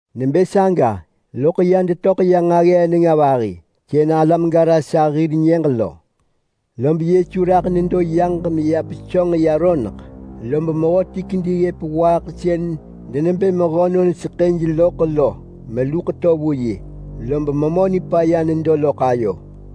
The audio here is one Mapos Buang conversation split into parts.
Nebë saga, lom ya detöḳ ya nġaggee nenga vahi, sën alam Garasa hir nyëġ lo. Lob Yesu raḳ nedo yaġ meya pesönġ ya roneḳ, lob mehöti kedi ggëp waaḳ sën denebë mehönon seḳëj loḳ lo meluḳ to vu yi, lob memö nipaya nedo loḳ ayo.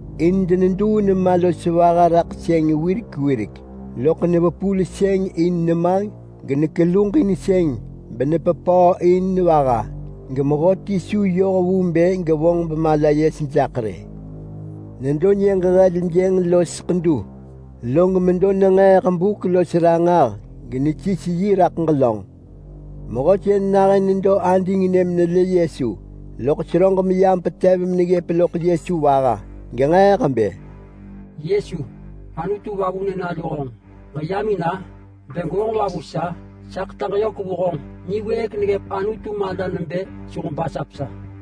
Gaḳ deneduu nema los vaha raḳ sëng wirek wirek, loḳ nevepul sëng in nema genekeluġin sëng benepepöö in vaha, gemehöti su yoh vu bë gevonġ bemala yes jaḳ rë. Nedo nyëġ heljënġ los ḳedu, log medo nenġeeḳ buk los ranġah genesis yi raḳ ġelönġ. Mehö sën nahën nedo adingnë menelë Yesu, loḳ seröġ meyam petev neggëp loḳ Yesu vaha, genġeeḳ bë, “Yesu, Anutu Vavunë nalu honġ. Ġeyam in-a? Bë gwevonġ va vu sa? Sa ḳetaġ yök vu honġ niwëëk neggëp Anutu mala nebë su ġebasap sa!”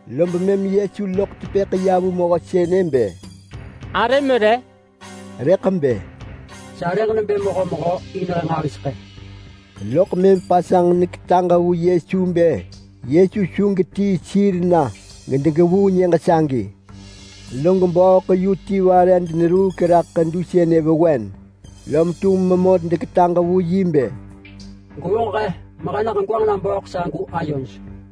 Lob mëm Yesu loḳ tepëḳ ya vu mehö sënë bë, “Arëm re?” Rëḳ bë, “Sarëġ nebë Mehömehö in he nġahiseḳë.” Loḳ mëm pasanġ neketaġ vu Yesu nebë Yesu su getii sir na gedegevuu nyëġ sagi. Log bööḳ yu ti vare deneruuk raḳ ḳedu sënë vewen, lom tum memö deketaġ vu yi bë, “Gwevonġ he mehe na ġegwanġ na bööḳ sagu ayoj.”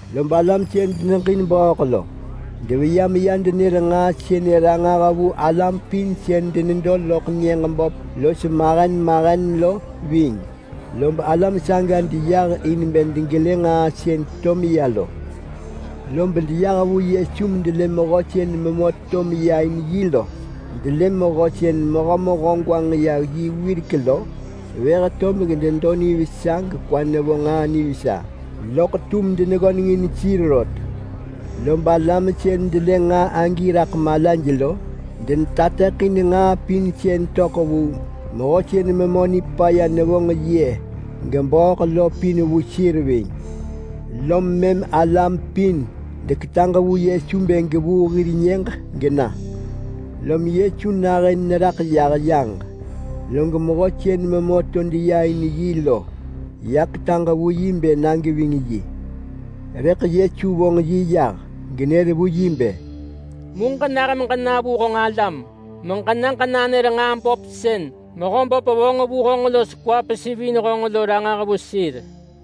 Lob alam sën deneġin bööḳ lo deveya meya denër nġaa sënë ranġah vu alam pin sën denedo loḳ nyëġ böp los mahen mahen lo ving. Lob alam saga deyah in bë degelë nġaa sën to meya lo. Lob deyah vu Yesu medelë mehö sën memö to deya in yi lo. Delë mehö sën Mehömehö gwanġ ya yi wirek lo vëh tob benedo nivesa gekwa nevo nġaa nivesa, loḳ tum deneggönengin sir rot. Lob alam sën delë nġaa agi raḳ malaj lo, denetateḳin nġaa pin sën töḳ vu mehö los memö nipaya gebööḳ lo pin vu sir ving. Lom mëm alam pin deketaġ vu Yesu bë gevuu hir nyëġ gena. Lom Yesu nahën neraḳ yah yaġ, log mehö sën memö to deya in yi lo ya ketaġ vu yi bë na geving yi. Rëḳ Yesu vonġ yi yah genër vu yi bë, “Mu ġenah meġena vu honġ alam meġena ġenanër nġaa böp sën Mehöböp vonġ vu honġ los kwa pesivin honġ lo ranġah vu sir.”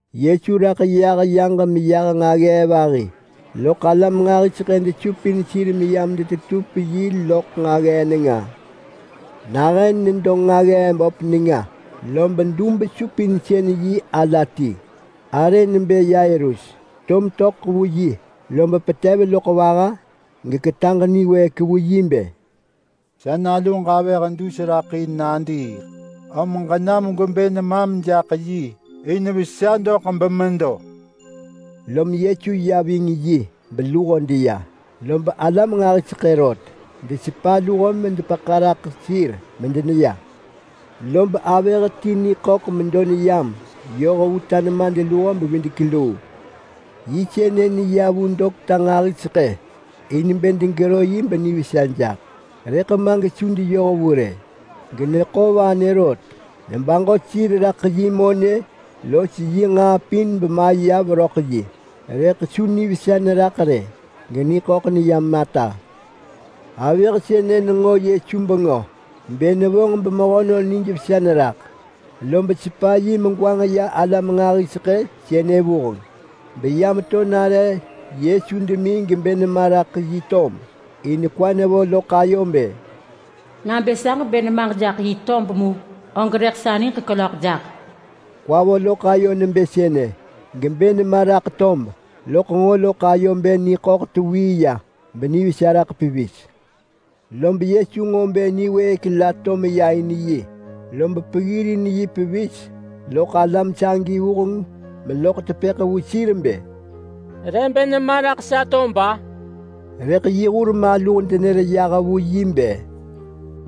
Yesu raḳ yaġ meyah meya nġaggee vahi galam nġahiseḳë desupin sir meyam detetup yi loḳ nġaggee nenga. Nahën nedo nġaggee böp nenga lob dub-supinsën-yi ala ti, arë nebë Yairus, to metöḳ vu yi, lob petev meto neggëp loḳ vaha, log ketaġ niwëëk vu yi bë, “Sa naluġ avëh dus raḳ in nadiiḳ. Om ġenam gwebë nemam jaḳ yi in vesa doḳ bemedo.” Lom Yesu ya ving yi beluho deya, lob alam nġahiseḳë rot desepa luho medepeḳa raḳ yi medeya ving. Lob avëh ti niḳöḳ medo neyam yoh vu ta nemadluho-bevidek-luu. Yi sënë neya vu dokta nġahiseḳë in bë degevonġ benivesa jaḳ, rëḳ ma gesu deyoh vu rë, geneḳo vanë rot. Baġo sir raḳ yi monë los yi nġaa pin bemaya veröḳ yi, rëḳ su nivesa neraḳ rë geniḳöḳ neyam ata. Avëh sënë lo nenġo Yesu bengö nebë nevonġ mehönon benijvesa neraḳ, lob mëm sepa yi begwanġ ya alam nġahiseḳë sënë lo vuheng atov, beyam to nare Yesu demi gebë nema raḳ yi tob, in kwa nevo loḳ ayo nebë, “Nabë sa ġebë nemaġ jaḳ yi tob mu, og rëḳ sa niġ kelöḳ jaḳ.” Kwa vo loḳ ayo nebë sënë, gebë nema raḳ tob genenġo loḳ ayo nebë niḳöḳ tewii ya benivesa raḳ pevis. Lob Yesu nġo bë niwëëk la to meya in yi, loḳ peggirin yi pevis loḳ alam sagi lo vuheng atov meloḳ tepëḳ vu sir nebë, “Re bë nema raḳ sa tob-a?” Rëḳ yi hur maluh denër yah vu yi bë,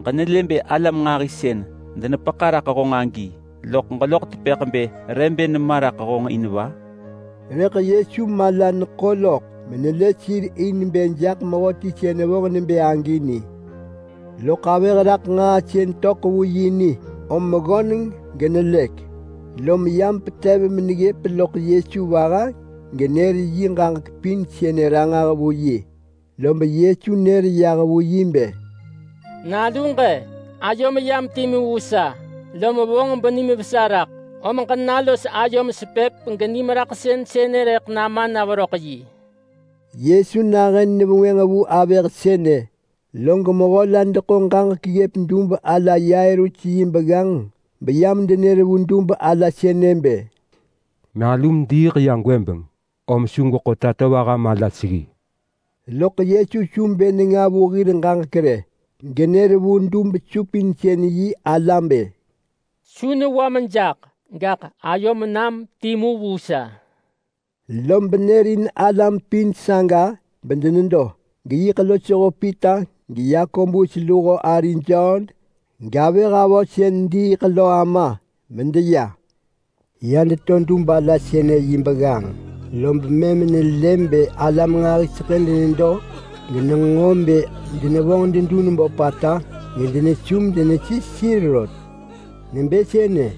“Ġenelë bë alam nġahi sën denepeḳa raḳ honġ rot, loḳ ġeloḳ tepëḳ bë re bë nema raḳ honġ in va?” Rëḳ Yesu mala neḳo loḳ menelë sir in bë jaḳ mehöti sën vonġ nebë agi ni. Loḳ avëh raḳ nġaa sën töḳ vu yi lo ni, om ggöneng menelëk, lom yam petev meneggëp loḳ Yesu vaha genër yi ġaġek pin sënë ranġah vu yi. Lob Yesu nër yah vu yi bë, “Naluġ-e! Ayom yam timu vu sa, lob vonġ benim vesa raḳ, om ġena los ayom sepëp genim raḳsën sënë rëḳ nama na veröḳ yi. Yesu nahën nevengwënġ vu avëh sënë, log mehö la deḳo ġaġek ggëp dub ala Yairus yi begganġ beyam denër vu dub ala sënë bë, “Nalum diiḳ ya gwëbeng, om su gweḳo Tatovaha mala seggi rë.” Loḳ Yesu su bë nenga vu hir ġaġek rë, genër vu dub-supinsën-yi ala bë, “Su newam jaḳ! Gaḳ ayom nam timu vu sa!” Lob nërin alam pin saga bedenedo, geyiḳ losho Pita geYakobus luho ari Jon, gavëh avö sën diiḳ lo ama, medeya. Ya deto dub ala sënë yi begganġ, lob mëm nelë bë alam nġahiseḳë denedo genenġo bë denevonġ dedun böpata gedenesu medenesis sir rot. Nebë sënë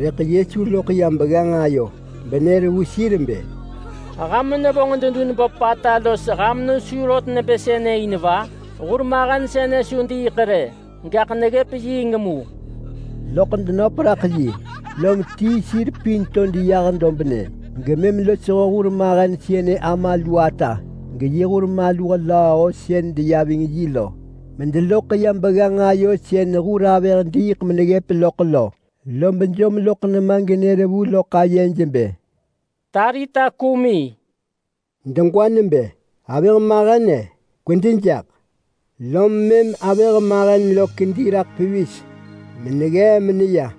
rëḳ Yesu loḳ ya begganġ ayo benër vu sir bë, “Ham nevonġ dedun böpata los ham nesu rot nebë sënë in va? Hurmahen sënë su diiḳ rë, gaḳ neggëp yiing mu!” Loḳ denöp raḳ yi, lom tii sir pin to deya dobnë gemëm losho hurmahen sënë ama lu ata, geyi hur maluh lööho sën deya ving yi lo, medeloḳ ya begganġ ayo sën hur avëh diiḳ meneggëp loḳ lo, lob jom loḳ nema genër vu loḳ ayej bë, “Talita kumi!” (Degwa nebë, “Avëh mahen-e! Kwedi jaḳ!”) Lom mëm avëh mahen lo kedi raḳ pevis meneggee meneya,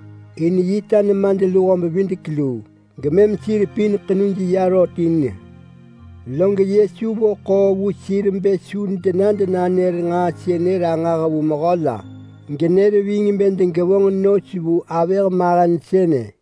in yi ta nemadluho-bevidek-luu. Gemem sir pin ḳenuj ya rot in. Log Yesu vo ḳoo vu sir bë su dena denanër nġaa sënë ranġah vu mehö la, genër ving bë degevonġ nos vu avëh mahen sënë.